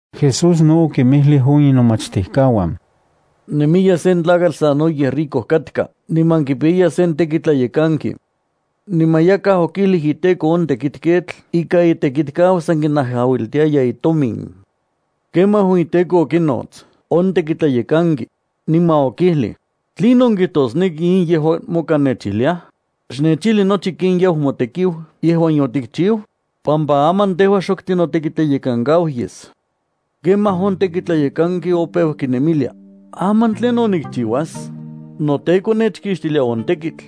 Jesús no okinmijlij on inomachtijkauan: —Nemiya sen tlakatl sanoyej rico katka niman kipiyaya sen tekitlayekanki. Niman yakaj okijlij iteko on tekitketl ika itekitkau san kinajauiltiaya itomin. Kemaj on iteko okinots on tekitlayekanki, niman okijlij: “¿Tlinon kijtosneki in yejuan moka nechijliaj? Xnechijli nochi ken yau motekiu yejuan yotikchiu, pampa aman tejua xok tinotekitleyenkankau yes.” Kemaj on tekitlayekanki opeu kinemilia: “¿Aman tlinon nikchiuas? Noteko nechkixtilia on tekitl.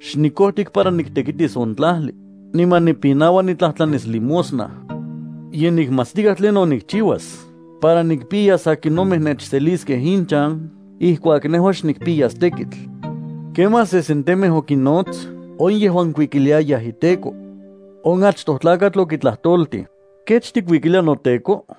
Xnikojtik para niktekitis on tlajli, niman nipinaua niktlajtlanis limosna. Ye nikmatstikaj tlinon nikchiuas para nikpiyas akinomej nechseliskej inchan ijkuak nejua xnikpiyas tekitl.” Kemaj sesentemej okinnots on yejuan kuikiliayaj iteko. On achtoj tlakatl okitlajtoltij: “¿Kech tikuikilia noteko?”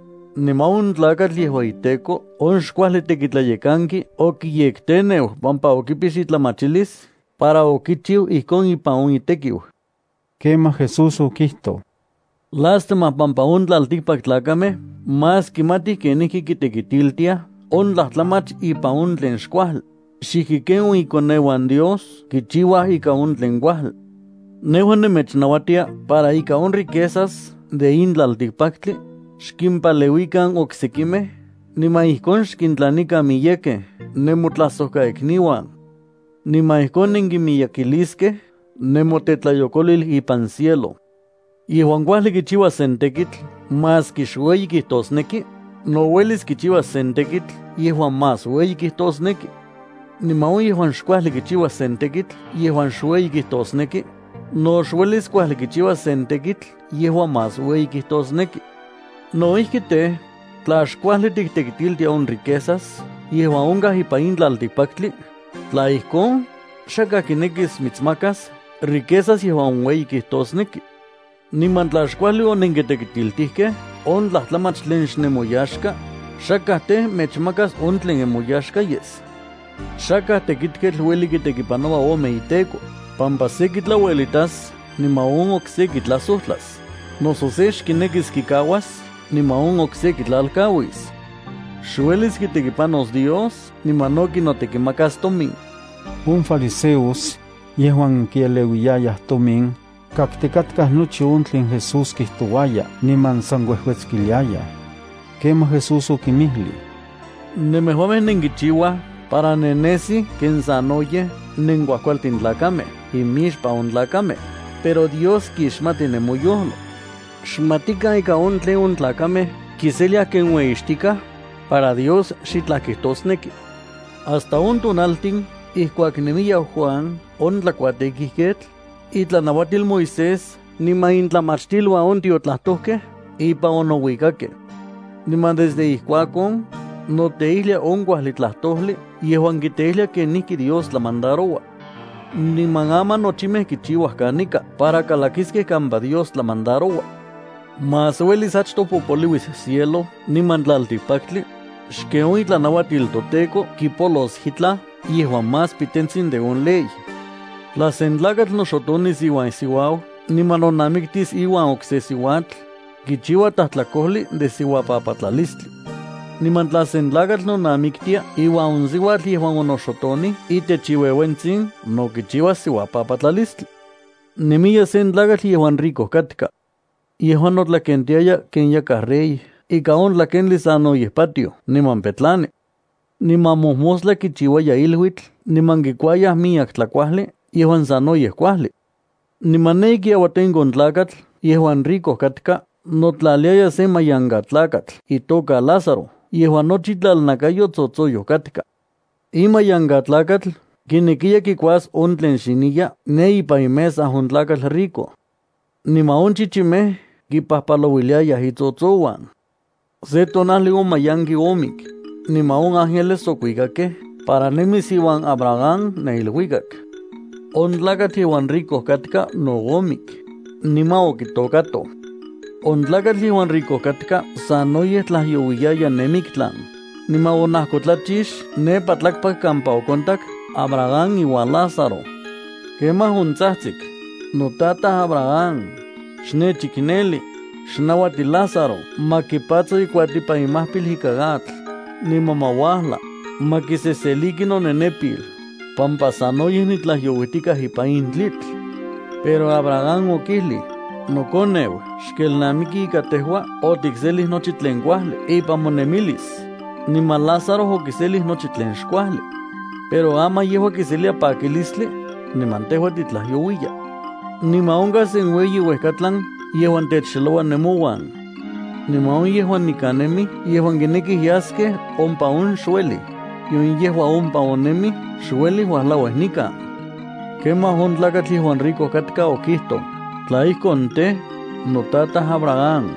Niman on tlakatl yejuan iteko on xkuajli tekitlayekanki okiyekteneu pampa okipix itlamachilis para okichiu ijkon ipan on itekiu. Kemaj Jesús okijtoj: —Lástima pampa on tlaltikpaktlakamej más kimatij kenijki kitekitiltiaj on tlajtlamach ipan on tlen xkuajli, xijki ken on ikoneuan Dios kichiuaj ika on tlen kuajli. ’Nejua nemechnauatia para ika on riquezas de in tlaltikpaktli, xkimpaleuikan oksekimej niman ijkon xkintlanikan miyekej nemotlajsojkaikniuan. Niman ijkon nenkimiyekiliskej nemotetlayokolil ipan cielo. ’Yejuan kuajli kichiua sen tekitl maski xueyi kijtosneki, no uelis kichiuas sen tekitl yejuan mas ueyi kijtosneki. Niman on yejuan xkuajli kichiua sen tekitl yejuan xueyi kijtosneki, no xuelis kuajli kichiuas sen tekitl yejuan mas ueyi kijtosneki. No ijki tej, tla xkuajli tiktekitiltia on riquezas yejuan onkaj ipan in tlaltikpaktli, tla ijkon, xakaj kinekis mitsmakas riquezas yejuan ueyi kijtosneki. Niman tla xkuajli onenkitekitiltijkej on tlajtlamach tlen xnemoyaxka, xakaj tej, mechmakas on tlen nemoyaxka yes. ’Xakaj tekitketl ueli kitekipanoua ome iteko, pampa se kitlauelitas niman on okse kitlajsojtlas, noso se xkinekis kikauas niman on okse kitlalkauis. Xuelis kitekipanos Dios niman no kinotekimakas tomin. On fariseos, yejuan kieleuiyayaj tomin, kaktikatkaj nochi on tlen Jesús kijtouaya niman san kuejuetskiliayaj. Kemaj Jesús okinmijlij: —Nemejuamej nenkichiuaj para nennesij ken sanoyej nenkuajkualtin tlakamej imixpan on tlakamej, pero Dios kixmati nemoyojlo. Xmatikan ika on tlen on tlakamej kiseliaj ken ueyixtikaj, para Dios xitlaj kijtosneki. ’Hasta on tonaltin ijkuak nemiya Juan on tlakuatekijketl, itlanauatil Moisés niman intlamachtiluan on tiotlajtojkej ipan onouikakej. Niman desde ijkuakon, noteijlia on kuajli tlajtojli yejuan kiteijlia kenijki Dios tlamandaroua. Niman aman nochimej kichiuaj kanika para kalakiskej kampa Dios tlamandaroua. ’Más uelis achtoj popoliuis cielo niman tlaltikpaktli, xken on itlanauatil toTEKO kipolos itlaj yejuan más pitentsin de on ley. ’Tla sen tlakatl noxotonis iuan isiuau niman nonamiktis iuan okse siuatl, kichiua tlajtlakojli de siuapapatlalistli. Niman tla sen tlakatl nonamiktia iuan on siuatl yejuan onoxotonij itech iueuentsin no kichiuas siuapapatlalistli. ’Nemiya sen tlakatl yejuan rico katka. Yejua notlakentiaya ken yakaj rey ikan on tlakentli sanoyej patioj niman petlani. Niman mojmostla kichiuaya iluitl niman kikuayaj miyek tlajkuajli yejuan sanoyej kuajli. Niman ne ikiauatenko on tlakatl yejuan rico katka notlaliaya sen mayankatlakatl itoka Lázaro yejuan nochi itlalnakayo tsotsoyoj katka. In mayankatlakatl kinekiya kikuas on tlen xiniya ne ipan imesa on tlakatl rico. Niman on chichimej kipajpalouiliayaj itsotsouan. Se tonajli on mayanki omik, niman on ángeles okuikakej para nemis iuan Abraham ne iluikak. On tlakatl yejuan rico katka no omik, niman okitokatoj. On tlakatl yejuan rico katka sanoyej tlajyouiaya ne miktlan, niman onajkotlachix nepa tlakpak kampa okontak Abraham iuan Lázaro. Kemaj ontsajtsik: “Notataj Abraham, ¡xnechikneli! Xnauati Lázaro ma kipatso ikuatipan imajpil ikan atl, niman ma uajla, ma kiseseliki nonenepil, pampa sanoyej nitlajyouijtikaj ipan in tlitl.” Pero Abraham okijlij: “Nokoneu, xkelnamiki ika tejua otikselij nochi tlen kuajli ipan monemilis, niman Lázaro okiselij nochi tlen xkuajli. Pero aman yejua kiselia pakilistli, niman tejua titlajyouiya. Niman onkaj sen ueyi uejkatlan yejuan techxeloua nemouan. Niman on yejuan nikan nemij yejuan kinekij yaskej ompa on xuelij, nion yejuan ompa on nemij xuelij uajlauij nikan.” Kemaj on tlakatl yejuan rico katka okijtoj: “Tla ijkon tej, notataj Abraham,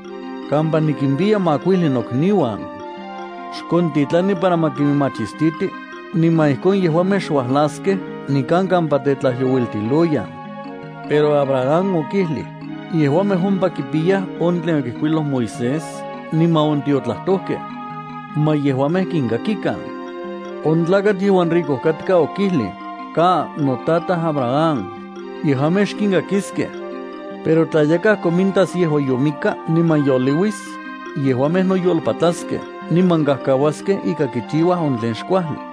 kampa nikimpiya makuijli nokniuan. Xkontitlani para ma kinmachistiti, niman ijkon yejuamej xuajlaskej nikan kampa tetlajyouiltiloyan.” Pero Abraham okijlij: “Yejuamej ompa kipiyaj on tlen okijkuiloj Moisés niman on tiotlajtojkej. Ma yejuamej kinkakikan.” On tlakatl yejuan rico katka okijlij: “Ka, notaj Abraham, yejuamej xkinkakiskej. Pero tla yakaj komintas yejuan yomikkaj niman yoliuis, yejuamej noyolpatlaskej niman kajkauaskej ika kichiuaj on tlen xkuajli.”